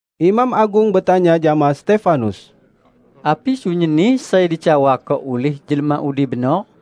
Imam agung betanya jama Stefanus, "Api sunyinni sai dicawako ulih jelma udi benor?"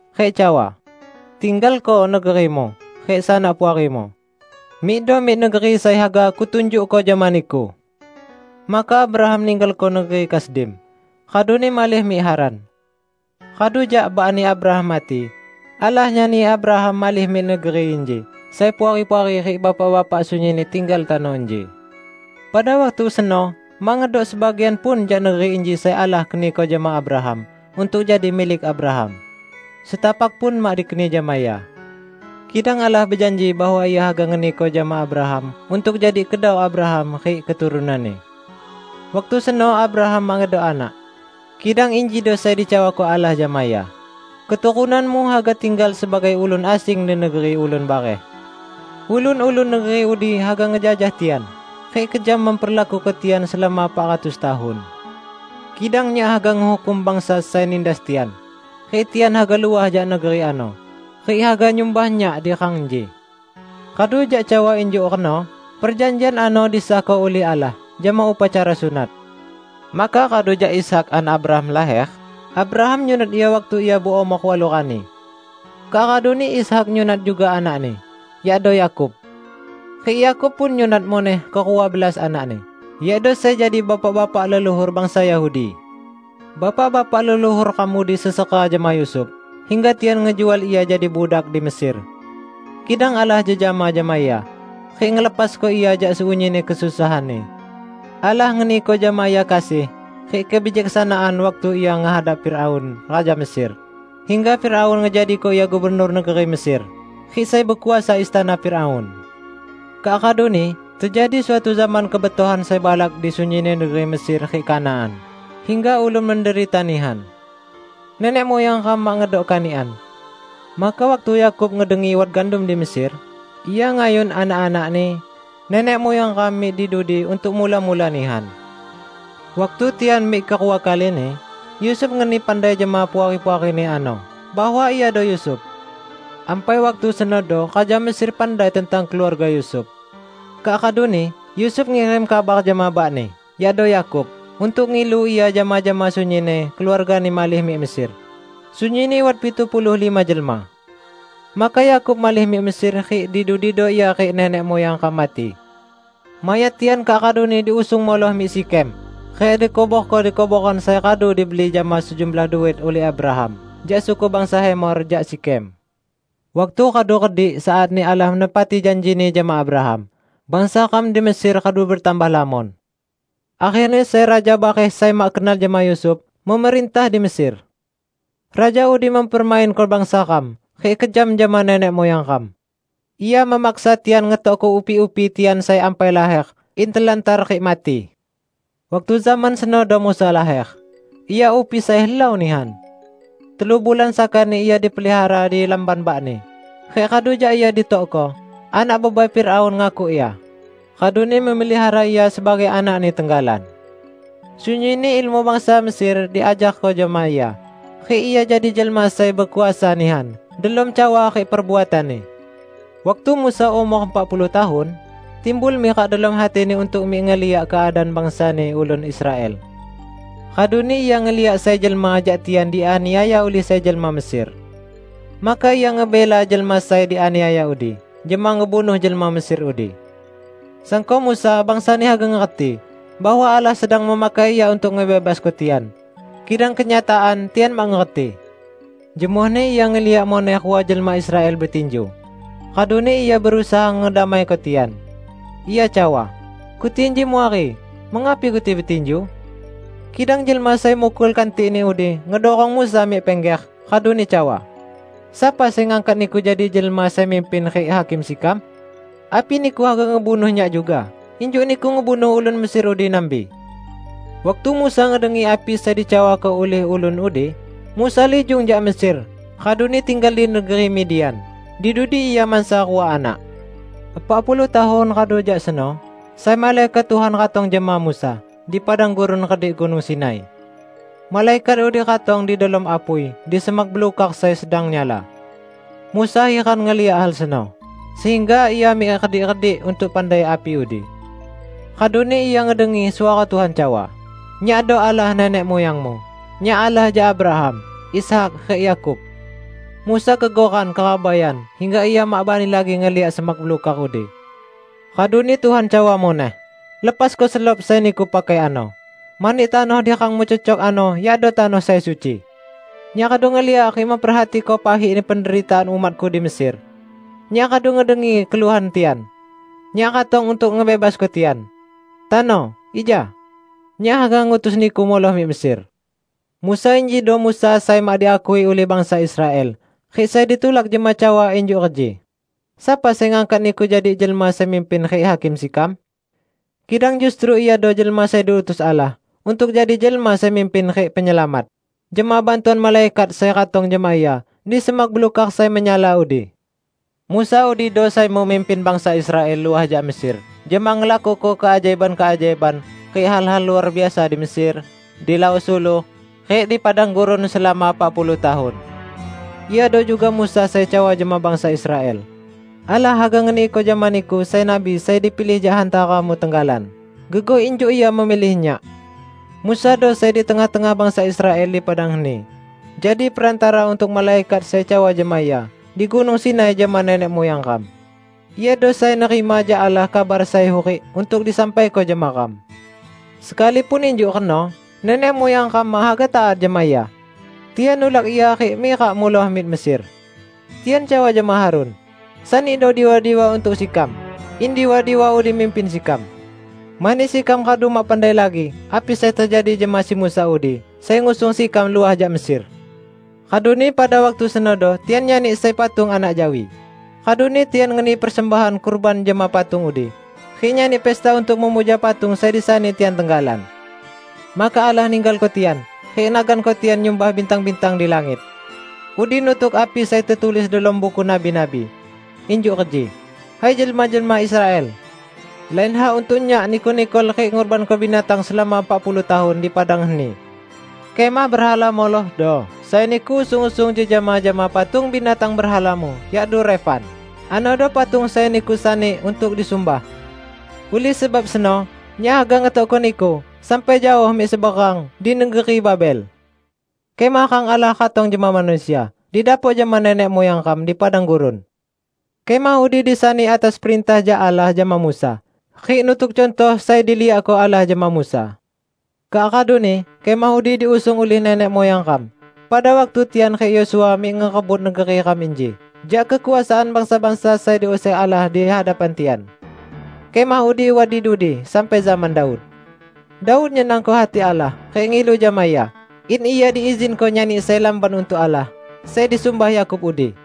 rik cawa, 'Tinggalko negerimu rik sanak puarimu. Mikdo mik negeri sai haga Kutunjukko jama niku.' Maka Abraham ninggalko negeri Kasdim, raduni malih mik Haran. Radu jak bakni Abraham mati, Allah nyani Abraham malih mik negeri inji sai Puari-puari rik Bapak-bapak sunyinni tinggal tano inji. Pada waktu seno mak ngedok sebagian pun jak negeri inji sai Allah keniko jama Abraham untuk jadi milik Abraham; setapak pun mak dikeni jama ia. Kidang Allah bejanji bahwa Ia haga ngeniko jama Abraham untuk jadi kedau Abraham rik keturunanni. Waktu seno Abraham mak ngedok anak. Kidang injido sai dicawako Allah jama ia, 'Keturunanmu haga tinggal sebagai ulun asing di negeri ulun bareh. Ulun-ulun negeri udi haga ngejajah tian rik kejam memperlakuko tian selama epak ratus tahun. Kidang Nyak haga ngehukum bangsa sai nindas tian, rik tian haga luah jak negeri ano rik haga nyumbah Nyak di rang inji.' Radu jak cawa injuk reno perjanjian ano disahko ulih Allah jama upacara sunat. Maka radu jak Ishak, anak Abraham laher, Abraham nyunat ia waktu ia beumor walu rani. Kak raduni Ishak nyunat juga anakni, yakdo Yakub. Rik Yakub pun nyunat muneh kerua belas anakni, yakdo sai jadi bapak-bapak leluhur bangsa Yahudi. Bapak-bapak leluhur ram udi sesera jama Yusuf, hingga tian ngejual ia jadi budak di Mesir. Kidang Allah jejama jama ia, rik ngelepasko ia jak sunyinni kesusahanni. Allah ngeniko jama ia kasih rik kebijaksanaan waktu ia ngehadap Firaun raja Mesir, hingga Firaun ngejadiko ia gubernur negeri Mesir rik sai bekuasa istana Firaun. Kak raduni tejadi suatu zaman kebetohan sai balak di sunyinni negeri Mesir rik Kanaan hingga ulun menderita nihan. Nenek muyang ram mak ngedok kanikan. Maka waktu Yakub ngedengi wat gandum di Mesir ia ngayun anak-anakni, nenek muyang ram, mik di dudi untuk mula-mula nihan. Waktu tian mik kerua kalini, Yusuf ngeni pandai jama puari-puarini ano bahwa iado Yusuf. Ampai waktu senodo raja Mesir pandai tentang keluarga Yusuf. Kak raduni Yusuf ngirim kabar jama bakni, yakdo Yakub, untuk ngilu ia jama-jama sunyinni keluargani malih mik Mesir -- sunyinni wat pitu puluh lima jelma. Maka Yakub malih mik Mesir rik di dudido ia rik nenek muyang ram mati. Mayat tian kak raduni diusung muloh mik Sikhem rik dikuborko di kuboran sai radu dibeli jama sejumlah duit ulih Abraham jak suku bangsa Hemor jak Sikhem. Waktu radu redik saatni Allah menepati janji-Ni jama Abraham, bangsa ram di Mesir radu betambah lamon. Akherni sai raja bareh sai mak kenal jama Yusuf, memerintah di Mesir. Raja udi mempermainko bangsa ram rik kejam jama nenek muyang ram. Ia memaksa tian ngetokko upi-upi tian sai ampai laher in telantar rik mati. Waktu zaman senodo Musa laher; ia upi sai helau nihan. Telu bulan sakani ia dipelihara di lamban bakni, rik radu jak ia ditokko, anak bebai Firaun ngakuk ia, raduni memelihara ia sebagai anakni tenggalan. Sunyinni ilmu bangsa Mesir diajarko jama ia rik ia jadi jelma sai bekuasa nihan delom cawa rik perbuatanni. Waktu Musa umor epak puluh tahun, timbul mirak delom hatini untuk mik ngeliak keadaan bangsani ulun Israel. Raduni ia ngeliak sai jelma jak tian dianiaya ulih sai jelma Mesir; maka ia ngebela jelma sai dianiaya udi jama ngebunuh jelma Mesir udi. Sangko Musa bangsani haga ngerti bahwa Allah sedang memakai ia untuk ngebebasko tian. Kidang kenyataan tian mak ngerti. Jemohni ia ngeliak muneh rua jelma Israel betinju, raduni ia berusaha ngedamaiko tian. Ia cawa, 'Keti inji muari. Mengapi keti betinju?' Kidang jelma sai mukul kantikni udi ngedurong Musa mik pingger raduni cawa, 'Sapa sai ngangkat niku jadi jelma sai mimpin rik hakim sekam? Api niku haga ngebunuh nyak juga injuk niku ngebunuh ulun Mesir udi nambi?' Waktu Musa ngedengi api sai dicawako ulih ulun udi, Musa lijung jak Mesir raduni tinggal di negeri Midian. Di dudi ia mansa rua anak. Epak puluh tahun radu jak seno sai malaikat Tuhan ratong jama Musa di padang gurun redik Gunung Sinai. Malaikat udi ratong di delom apui di semak belukar sai sedang nyala. Musa hiran ngeliak hal seno, sehingga ia mik redik-redik untuk pandai api udi. Raduni ia ngedengi suara Tuhan cawa, 'Nyakdo Allah nenek muyangmu; Nyak Allah jak Abraham, Ishak, rik Yakub.' Musa gegoran kerabaian hingga ia mak bani lagi ngeliak semak belukar udi. Raduni Tuhan cawa muneh, 'Lepasko selop sai niku pakai ano, mani tanoh di rangmu cecok ano yakdo tanoh sai suci. Nyak radu ngeliak rik memperhatiko pahikni penderitaan umat-Ku di Mesir. Nyak radu ngedengi keluhan tian, Nyak ratong untuk ngebebasko tian. Tano, ija! Nyak haga ngutus niku muloh mik Mesir.' Musa injido Musa sai mak diakui ulih bangsa Israel rik sai ditulak jama cawa injuk reji, 'Sapa sai ngangkat niku jadi jelma sai mimpin rik hakim sekam?' Kidang justru iado jelma sai diutus Allah untuk jadi jelma sai mimpin rik penyelamat, jama bantuan malaikat sai ratong jama ia di semak belukar sai menyala udi. Musa udido sai memimpin bangsa Israel luah jak Mesir jama ngelakuko keajaiban-keajaiban rik hal-hal luar biasa di Mesir, di Laok Suluh, rik di padang gurun selama epak puluh tahun. Iado juga Musa sai cawa jama bangsa Israel, 'Allah haga ngeniko jama niku sai nabi sai dipilih jak hantaramu tenggalan, gegoh injuk Ia memilih nyak.' Musado sai di tengah-tengah bangsa Israel di padang heni, jadi perantara untuk malaikat sai cawa jama ia di Gunung Sinai jama nenek muyang ram. Iado sai nerima jak Allah kabar sai hurik untuk disampaiko jama ram. Sekalipun injuk reno nenek muyang ram mak haga taat jama ia. Tian nulak ia rik mirak muloh mik Mesir. Tian cawa jama Harun, 'Sanido diwa-diwa untuk sekam, in diwa-diwa udi mimpin sekam. Mani sekam radu mak pandai lagi api sai tejadi jama si Musa udi sai ngusung sekam luah jak Mesir!' Raduni pada waktu senodo tian nyani sai patung anak jawi, raduni tian ngeni persembahan kurban jama patung udi rik nyani pesta untuk memuja patung sai disani tian tenggalan. Maka Allah ninggalko tian rik naganko tian nyumbah bintang-bintang di langit. Udi nutuk api sai tetulis delom buku nabi-nabi. Injuk reji, 'Hai jelma-jelma Israel! Lain hak untuk Nyak niku nikol rik ngurbanko binatang selama epak puluh tahun di padang heni. Kemah berhala Molokhdo sai niku usung-usung jejama jama patung binatang berhalamu, yakdo Refan; anodo patung sai niku sani untuk disumbah. Ulih sebab seno Nyak haga ngetokko niku sampai jaoh mik seberang di negeri Babel.' Kemah rang Allah ratong jama manusia didapok jama nenek muyang ram di padang gurun. Kemah udi disani atas perintah jak Allah jama Musa rik nutuk cuntoh sai diliakko Allah jama Musa. Kak raduni kemah udi diusung ulih nenek muyang ram pada waktu tian rik Yosua mik ngerebut negeri ram inji jak kekuasaan bangsa-bangsa sai diuser Allah di hadapan tian. Kemah udi wat di dudi sampai zaman Daud. Daud nyenangko hati Allah rik ngilu jama Ia in ia diizinko nyani sai lamban untuk Allah sai disumbah Yakub udi.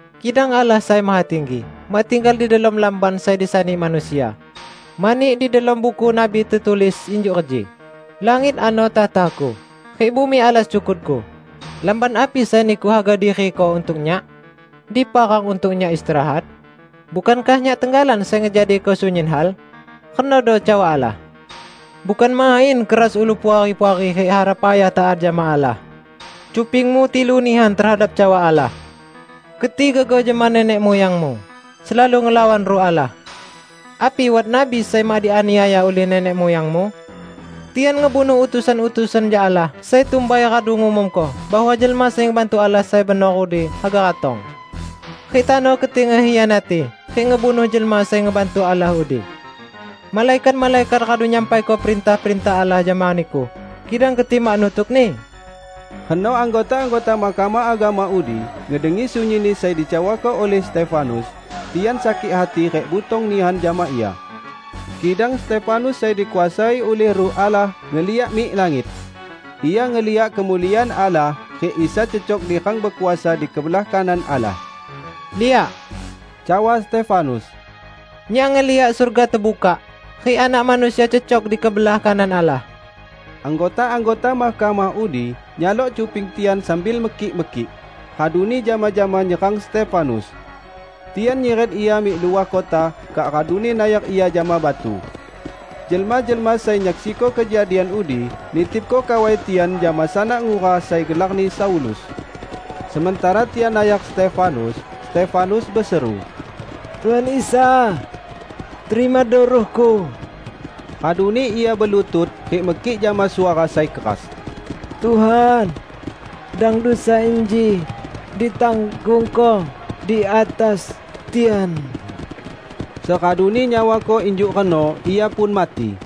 Kidang Allah Sai Mahatinggi mak tinggal di delom lamban sai disani manusia; mani di delom buku nabi tetulis injuk reji, 'Langit ano takhta-Ku, rik bumi alas cukut-Ku. Lamban api sai niku haga diriko untuk Nyak? Dipa rang untuk Nyak istirahat? Bukankah Nyak tenggalan sai ngejadiko sunyin hal?' renodo cawa Allah. Bukan main keras ulu Puari-puari rik hara payah taat jama Allah! Cupingmu tilu nihan tehadap cawa Allah! Keti gegoh jama nenek muyangmu; selalu ngelawan Ruh Allah! Api wat nabi sai mak dianiaya ulih nenek muyangmu? Tian ngebunuh utusan-utusan jak Allah sai tumbai radu ngumumko bahwa Jelma Sai Ngebantu Allah sai benor udi haga ratong. Rik tano keti ngekhianati rik ngebunuh Jelma Sai Ngebantu Allah udi. Malaikat-malaikat radu nyampaiko perintah-perintah Allah jama niku kidang keti mak nutukni!" Reno anggota-anggota Mahkamah Agama udi ngedengi sunyinni sai dicawako ulih Stefanus, tian sakik hati rik butong nihan jama ia. Kidang Stefanus sai dikuasai ulih Ruh Allah, ngeliak mik langit. Ia ngeliak kemuliaan Allah rik Isa cecok di rang bekuasa di kebelah kanan Allah. "Liak," cawa Stefanus, "nyak ngeliak surga tebukak rik Anak Manusia cecok di kebelah kanan Allah!" Anggota-anggota mahkamah udi nyalok cuping tian sambil mekik-mekik, raduni jama-jama nyerang Stefanus. Tian nyiret ia mik luah kota kak raduni nayar ia jama batu. Jelma-jelma sai nyaksiko kejadian udi nitipko kawai tian jama sanak ngura sai gelarni Saulus. Sementara tian nayar Stefanus, Stefanus beseru, "Tuhan Isa, terimado ruhku!" Raduni ia belutut rik mekik jama suara sai keras, "Tuhan, dang dusa inji ditanggungko di atas tian!" Seraduni nyawako injuk reno ia pun mati.